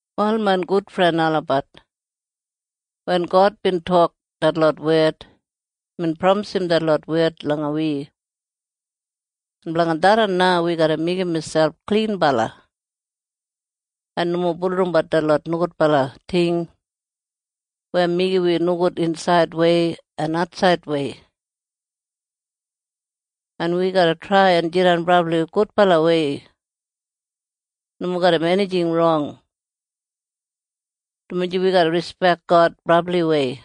Wal main gudfren olabat, wen God bin tok detlot wed, imbin pramisim detlot wed langa wi. En blanga tharran na wi garra meigim miselp klinbala en nomo bulurrumbat detlot nogudbala ting weya meigim wi nogud insaidwei en atsaidwei. En wi garra trai en jidan brabli gudbalawei nomo garram enijing rong, dumaji wi garra rispek God brabliwei.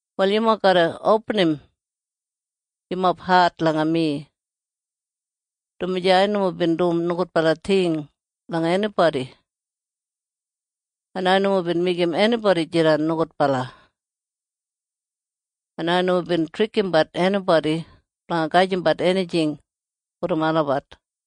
Wal yumob garra opinim yumob hat langa mi, dumaji ai nomo bin dum nogudbala ting langa enibodi, en ai nomo bin meigim enibodi jidan nogudbala, en ai nomo bin trikimbat enibodi blanga gajimbat enijing brom olabat.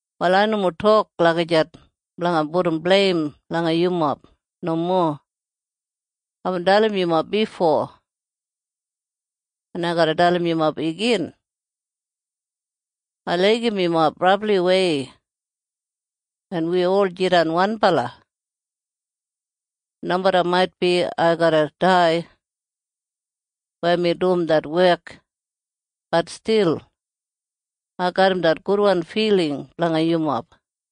Wal ai nomo tok lagijat blanga pudum bleim langa yumob. Nomo. Aibin dalim yumob bifo, en ai garra dalim yumob igin. Ai laigim yumob brabliwei, en wi ol jidan wanbala. En nomeda maitbi ai garra dai weya mi dum det wek, bat stil ai garram det gudwan filing blanga yumob.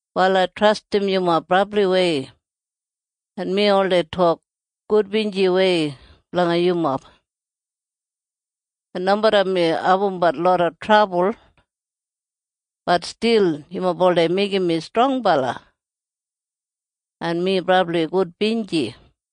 Wal ai trastim yumob brabliwei, en mi oldei tok gudbinjiwei blanga yumob. En nomeda mi abumbat loda trabul, bat stil yumob oldei meigim mi strongbala, en mi brabli gudbinji.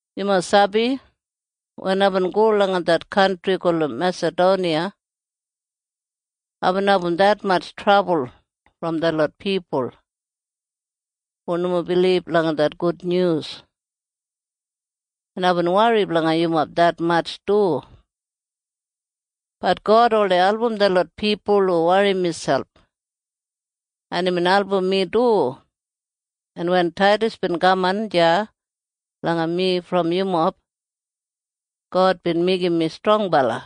Yumob sabi? Wen aibin go langa det kantri gulum Mesadoniya, aibin abum detmatj trabul brom detlot pipul hu nomo bilib langa det gudnyus, en aibin wori blanga yumob detmatj du. Bat God oldei album detlot pipul hu wori miselp, en imbin album mi du, en wen Taidas bin kaman deya langa mi brom yumob, God bin meigim mi strongbala.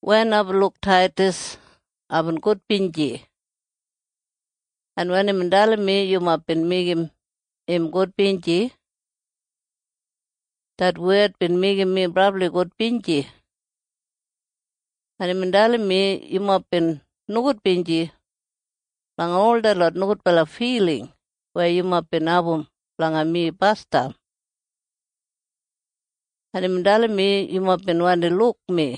Wen aibin luk Taidas, aibin gudbinji. En wen imbin dalim mi yumob bin meigim im gudbinji, det wed bin meigim mi brabli gudbinji. En imbin dalim mi yumob bin nogudbinji blanga ol detlot nogudbala filing weya yumob bin abum blanga mi basdam, en imbin dalim mi yumob bin wandi luk mi,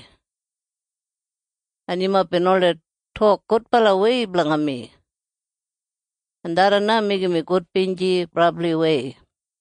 en yumob bin oldei tok gudbalawei blanga mi. En tharran na meigim mi gudbinji brabliwei.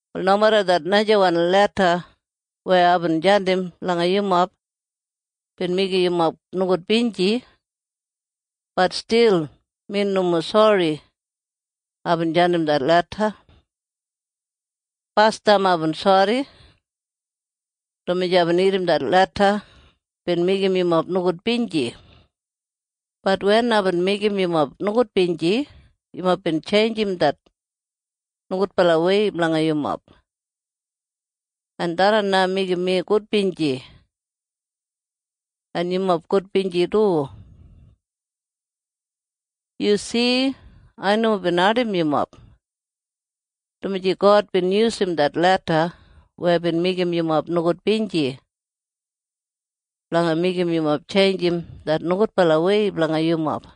Wal nomeda det najawan leda weya aibin jandim langa yumob bin meigim yumob nogudbinji, bat stil mi nomo sori aibin jandim det leda. Basdam aibin sori, dumaji aibin irrim det leda bin meigim yumob nogudbinji. Bat wen aibin meigim yumob nogudbinji, yumob bin tjeinjim det nogudbalawei blanga yumob. En tharran na meigim mi gudbinji. En yumob gudbinji du. Yu si? Ai nomo bin ardim yumob, dumaji God bin yusum det leda weya bin meigim yumob nogudbinji blanga meigim yumob tjeinjim det nogudbalawei blanga yumob.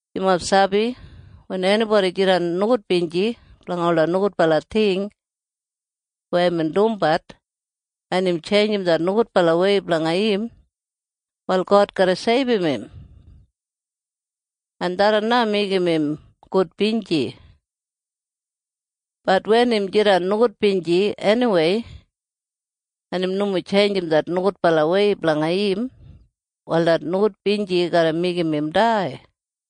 Yumob sabi? Wen enibodi jidan nogudbinji blanga ola nogudbala ting weya imbin dumbat, en im tjeinjim det nogudbalawei blanga im, wal God garra seibum im. En tharran na meigim im gudbinji. Bat wen im jidan nogudbinji eniwei, en im nomo tjeinjim det nogudbalawei blanga im, wal det nogudbinji garra meigim im dai.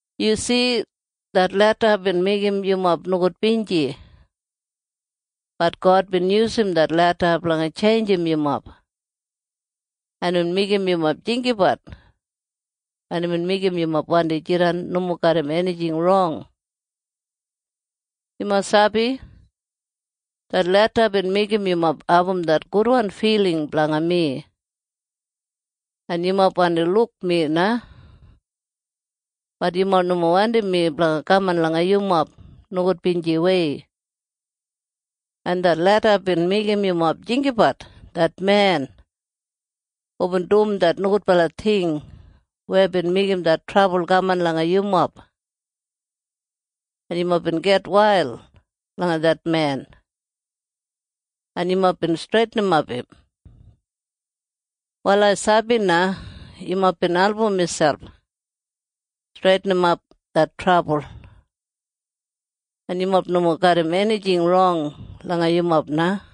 Yu si? Det leda bin meigim yumob nogudbinji. Bat God bin yusum det leda blanga tjeinjim yumob, en imbin meigim yumob jinggabat, en imbin meigim yumob wandi jidan nomo garram enijing rong. Yumob sabi? Det leda bin meigim yumob abum det gudwan filing blanga mi, en yumob wandi luk mi na. Bat yumob nomo wandim mi blanga kaman langa yumob nogudbinjiwei. En det leda bin meigim yumob jinggabat det men hubin dum det nogudbala ting weya bin meigim det trabul kaman langa yumob. En yumob bin gitwail langa det men, en yumob bin streitinimap im. Wal ai sabi na yumob bin album miselp streitinimap det trabul, en yumob nomo garram enijing rong langa yumob na.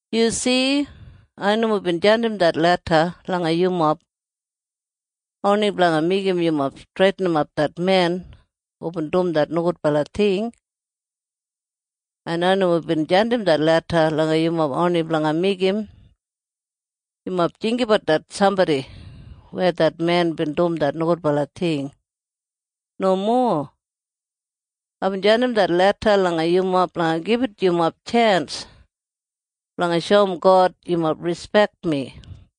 Yu si? Ai nomo bin jandim det leda langa yumob oni blanga meigim yumob streitinimap det men hubin dum det nogudbala ting. En ai nomo bin jandim det leda langa yumob oni blanga meigim yumob jinggabat det sambodi weya det men bin dum det nogudbala ting. Nomo. Aibin jandim det leda langa yumob blanga gibit yumob tjens blanga shoum God yumob rispek mi.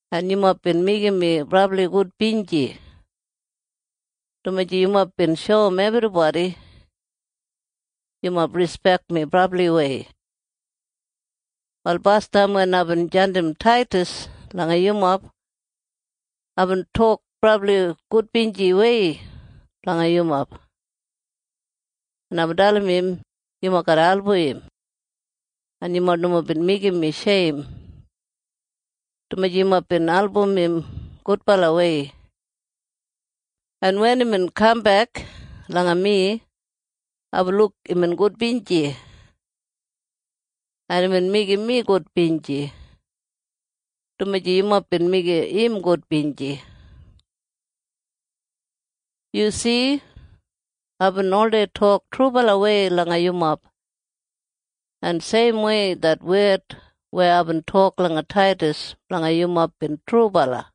En yumob bin meigim mi brabli gudbinji, dumaji yumob bin shoum ebribodi yumob rispek mi brabliwei. Wal basdam wen aibin jandim Taidas langa yumob, aibin tok brabli gudbinjiwei blanga yumob, en aibin dalim im yumob garra album im. En yumob nomo bin meigim mi sheim, dumaji yumob bin album im gudbalawei. En wen imbin kambek langa mi, aibin luk imbin gudbinji. En imbin meigim mi gudbinji, dumaji yumob bin meigim im gudbinji. Yu si? Aibin oldei tok trubalawei langa yumob, en seimwei det wed weya aibin tok langa Taidas blanga yumob bin trubala.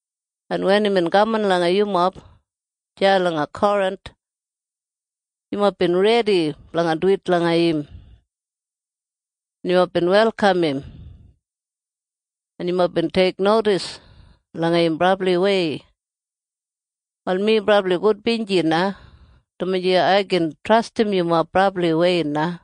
En wen imbin kaman langa yumob deya langa Korinth, yumob bin redi blanga duwit langa im, en yumob bin welkam im, en yumob bin teiknodis langa im brabliwei. Wal mi brabli gudbinji na, dumaji ai gin trastim yumob brabliwei na.